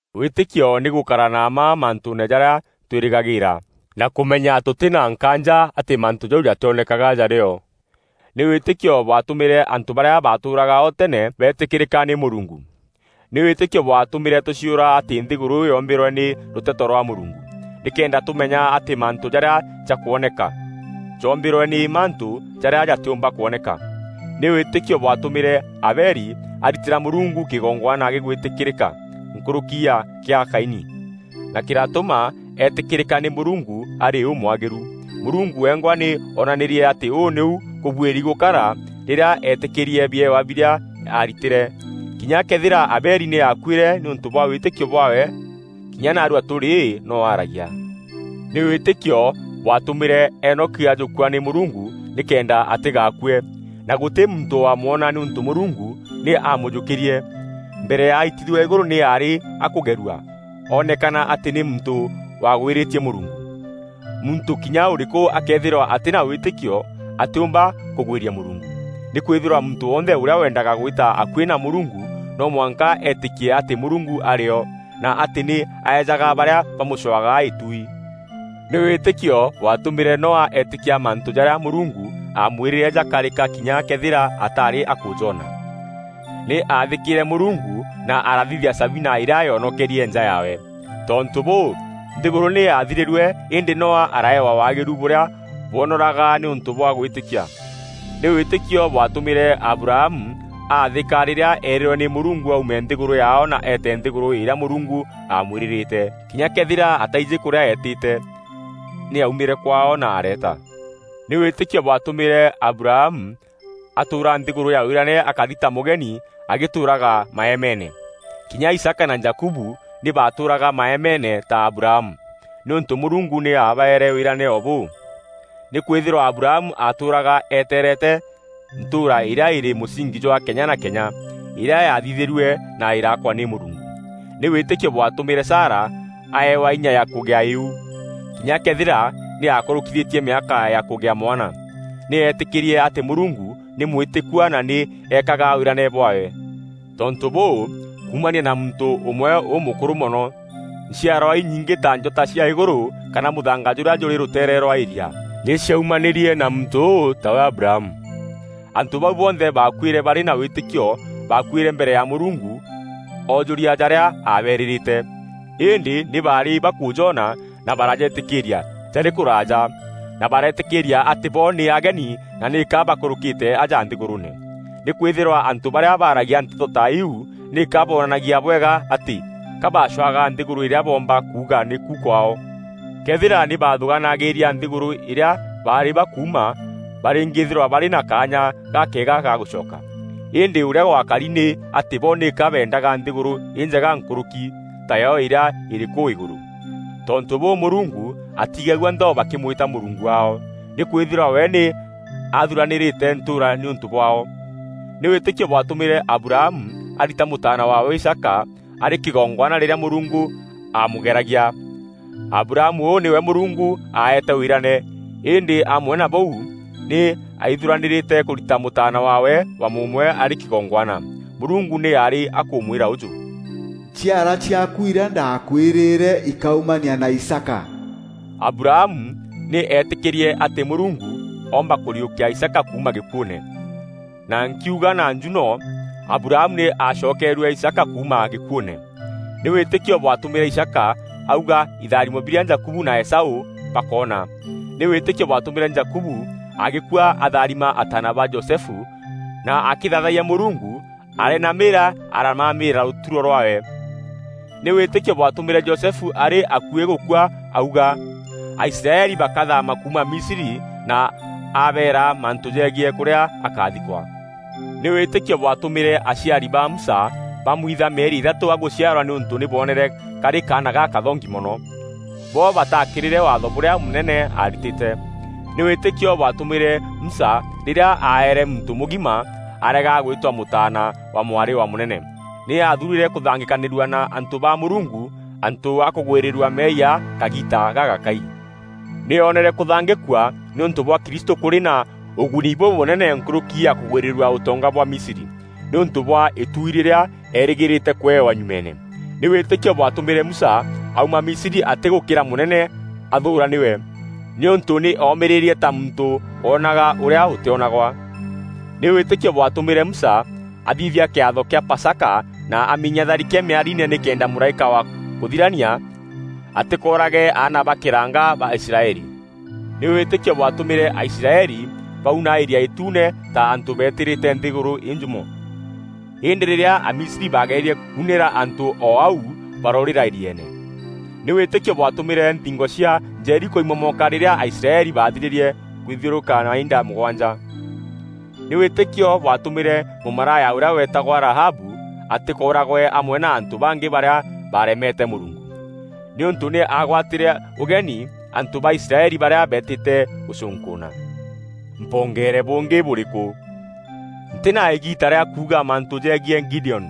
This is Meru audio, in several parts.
Wîtîkio nî gûkara na mma mantûûne jarîa twîrîgagîîra, na kûmenya tûtî na nkaanja atî mantû jau jatîonekaga jarî o. Nî wîtîkio bwatûmîre antû barîa baatûûraga o tene beetîkîrîka nî Mûrungu. Nî wîtîkio bwatûmîre tûciûra atî nthîgûrû yoombîrwe nî rûteto rwa Mûrungu, nîkenda tûmenya atî mantû jarîa jakwoneka, joombîrwe nî mantû jarîa jatîûmba kwoneka. Nî wîtîkio bwatûmîre Abeli aritîra Mûrungu kîgongwana gîgwîtîkîrîka nkûrûki ya gîa Kaini, na kîratûma eetîkîrîka nî Mûrungu arî ûmwagîru. Mûrungu wengwa nî oonanîrie atî ûu nîu kûbuîri gûkara rîrîa eetîkîrîrie biewa birîa aaritîre. Kinya këethîra Abeli nî aakuîre, nîûntû bwa wîtîkio bwaawe, kinya naarua tûrî no aragia. Nî wîtîkio bwatûmîre Enoki ajûkua nî Mûrungu nîkenda atîgaakue, na gûtî muntû waamwona nîûntû Mûrungu nî aamûjûkîrie. Mbere ya aitithua îgûrû nî aarî akûgerua oonekana atî nî muntû waagwîrîtie Mûrungu. Muntû kinya ûrîkû akëethîrwa atî na wîtîkio atîûmba kûgwîria Mûrungu. Nîkwîthîrwa muntû wonthe ûrîa weendaga gwîta akuî na Mûrungu no mwanka eetîkie atî Mûrungu arî o, na atî nî aejaga barîa bamûcwaga îtuui. Nî wîtîkio bwatûmîre Noa eetîkia mantû jarîa Mûrungu aamwîrîre jagakarîka kinya këethîra ataarî akûjoona. Nî aathîkîîre Mûrungu na arathithia Sabina îrîa yoonokerie nja yaawe. Tontû bûû, nthîgûrû nî yaathirîrue îndî Noa araaewa waagîru bûrîa bwonoraga nîûntû bwa gwîtîkia. Nî wîtîkio bwatûmîre Abrahamu aathîka rîrîa eerîrwe nî Mûrungu aume nthîgûrû yaao na eete nthîgûrû îrîa Mûrungu aamwîrîrîte. Kinya këethîra ataijî kûrîa eetîte, nî aumîre kwaao na areeta. Nî wîtîkio bwatûmîre Abrahamu atûûra nthîgûrû ya wîrane akari ta mûgeni agîtûûraga maemeene. Kinya Isaaka na Jakubu nî baatûûraga maemeene ta Abrahamu, nîûntû Mûrungu nî aabaeere wîrane o bûu. Nîkwîthîrwa Abrahamu aatûûraga eteerete ntûûra îrîa îrî mûsingi jwa kenya na kenya, îrîa yaathithîrue na îraakwa nî Mûrungu. Nî wîtîkio bwatûmîre Sara aewa inya na kûgîa îu, kinya këethîra nî aakûrûkîthîtie mîaka ya kûgîa mwana. Nî eetîkîrie atî Mûrungu nî mwîtîkua na nî eekaga wîrane bwaawe. Tontû bûû, kuumania na muntû ûmwe ûmûkûrû mono, nchiarwa inyingî ta njota cia îgûrû kana mûthanga jûrîa jûrî rûteere rwa îria nî ciaumanîrie na muntû ûu, tawe Abrahamu. Antû bau bonthe baakuîre barî na wîtîkio. Baakuîre mbere ya Mûrungu oojûria jarîa aabeerîîrîte. Îndî nî baarî bakûjona na barajetîkîîria jarî kûraaja, na bareetîkîîria atî bo nî ageni na nîka baakûrûûkîrîte aja nthîgûrûûne. Nîkwîthîrwa antû barîa baragia nteto ta iu nîka boonanagia bwega atî ka baacwaga nthîgûrû îrîa boomba kuuga nîku kwaao. Këethîra nî baathûgaanagîria nthîgûrû îrîa baarî bakuuma barîngîîthîrwa barî na kaanya gakeega ga gûcoka. Îndî ûrîa gwakari nî atî bo nîka beendaga nthîgûrû înjega nkûrûki, tayo îrîa îrî kûu îgûrû. Tontû bûû, Mûrungu atigagua nthao bakîmwîta Mûrungu waao, nîkwîthîrwa we nî athûranîrîte ntûûra nîûntû bwaao. Nî wîtîkio bwatûmîre Abrahamu arita mûtaana waawe Isaaka arî kîgongwana rîrîa Mûrungu aamûgeragia. Abrahamu ûu nîwe Mûrungu aeete wîrane, îndî amwe na bûu nî aaithûranîrîte kûrita mûtaana waawe wa mûûmwe arî kîgongwana. Mûrungu nî aarî akûmwîra ûjû, “Nchiarwa ciaaku irîa ndaakwîrîre ikaumania na Isaaka.” Abrahamu nî eetîkîrie atî Mûrungu oomba kûriûkia Isaaka kuuma gîkuûne, na nkiuga na njuno, Abrahamu nî aacokeerue Isaaka kuuma gîkuûne. Nî wîtîkio bwatûmîre Isaaka auga îtharimo birîa Jakubu na Esaû bakoona. Nî wîtîkio bwatûmîre Jakubu agîkua atharima ataana ba Josefu na akîthaathayia Mûrungu areenamîîria aramamîra rûturo rwaawe. Nî wîtîkio bwatûmîre Josefu arî akuî gûkua auga Aisraeli bakathaama kuuma Misri na abeera mantû jegiî kûrîa akathikwa. Nî wîtîkio bwatûmîre aciari ba Musa bamwitha mîeri îthatû agûciarwa nîûntû nî boonere karî kaana gakathongi mono. Bo bataakîrîre waatho bûrîa mûnene aaritîte. Nî wîtîkio bwatûmîre Musa rîrîa aaere muntû mûgima, arega gwîtwa mûtaana wa mwarî wa mûnene. Nî aathuurîre kûthangîkanîrua na antû ba Mûrungu antû a kûgwîrîrua meeyia kagiita gagakai. Nî oonere kûthangîkua nîûntû bwa Kristû kûrî na ûguni bûbûnene nkûrûki ya kûgwîrîrua ûtonga bwa Misri, nîûntû bwa îtuui rîrîa eerîgîîrîte kûewa nyumeene. Nî wîtîkio bwatûmîre Musa auma Misri atîgûkîra mûnene athûûra nîwe, nîûntû nî oomîrîrie ta muntû woonaga ûrîa ûtîonagwa. Nî wîtîkio bwatûmîre Musa athithia kîatho kîa Pasaka na aminya tharike mîariine nîkenda Mûraîka wa kûthirania atîkoorage aana ba kîranga ba Aisraeli. Nî wîtîkio bwatûmîre Aisraeli bauna Îria Îtuune ta antû betîrîte nthî înjûmo. Îndî rîrîa Amisri baagererie kuunîra antû o au baraûrîra îrieene. Nî wîtîkio bwatûmîre nthingo cia Jeriko imomoka rîrîa Aisraeli baathirîrie kwithiûrûka mainda mûgwanja. Nî wîtîkio bwatûmîre mûmaraya ûrîa weetagwa Rahabu atîkooragwe amwe na antû bangî barîa baaremete Mûrungu, nîûntû nî aagwatîre ûgeni antû ba Israeli barîa beetîte gûcûnkûûna. Mpongeere bûngî bûrîkû? Ntî na îgiita rîa kuuga mantû jegiî Gideoni,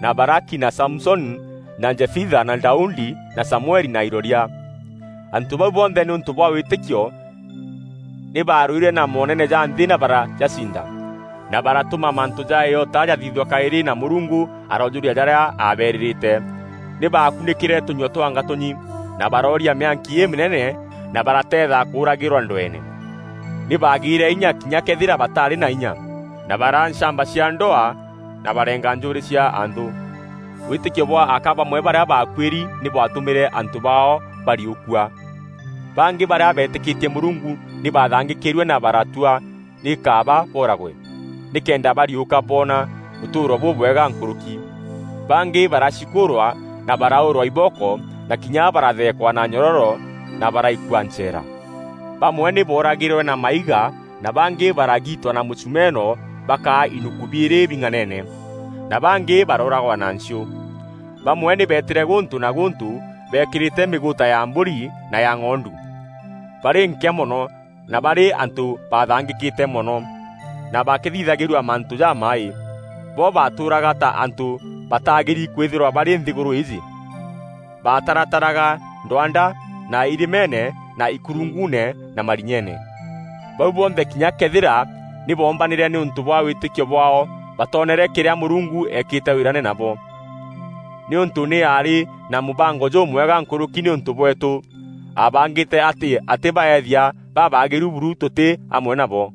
na Baraki, na Samusoni, na Jefitha, na Daudi, na Samueli na iroria. Antû bau bonthe nîûntû bwa wîtîkio nî baarwîre na moonene ja nthî na barajacinda na baratûma mantû ja îota jathithua kaîrî, na Mûrungu aroojûria jarîa aabeerîîrîte. Nî baakunîkîre tûnyua twa ngatûnyi, na barooria mîanki îmînene, na barateetha kûûragîrwa ndweene. Nî baagîîre inya kinya këethîra bataarî na inya, na baraa nchamba cia ndwaa na bareenga njûûrî cia anthû. Wîtîkio bwa aka bamwe barîa baakuîri nî bwatûmîre antû baao bariûkua. Bangî barîa beetîkîtie Mûrungu nî bathangîkîrue na baratua nî kaaba booragwe nîkenda bariûka boona ûtûûro bûbwega nkûrûki. Bangî baracikûûrwa na baraûûrwa ibooko, na kinya baratheekwa na nyororo na baraikua ncheera. Bamwe nî booragîrwe na maiga na bangî baragiitwa na mûchumeno bakaa inuku biîrî bing'anene, na bangî barooragwa na nchiû. Bamwe nî beetîre gûntû na gûntû beekîrîte mîgûûta ya mbûri na ya ng'ondu, barî nkîa mono, na barî antû bathangîkîte mono, na bakîthithagîrua mantû jamaaî. Bo baatûûraga ta antû bataagîri kwîthîrwa barî nthîgûrû îîjî. Baatarataraga ndwanda, na irîmeene, na ikurunguune na marinyeene. Bau bonthe kinya këethîra nî boombanîre nîûntû bwa wîtîkio bwaao, batoonere kîrîa Mûrungu eekîte wîrane nabo, nîûntû nî aarî na mûbango jûmwega nkûrûki nîûntû bweetû. Aabangîte atî atîbaethia babaagîru buru tûtî amwe nabo.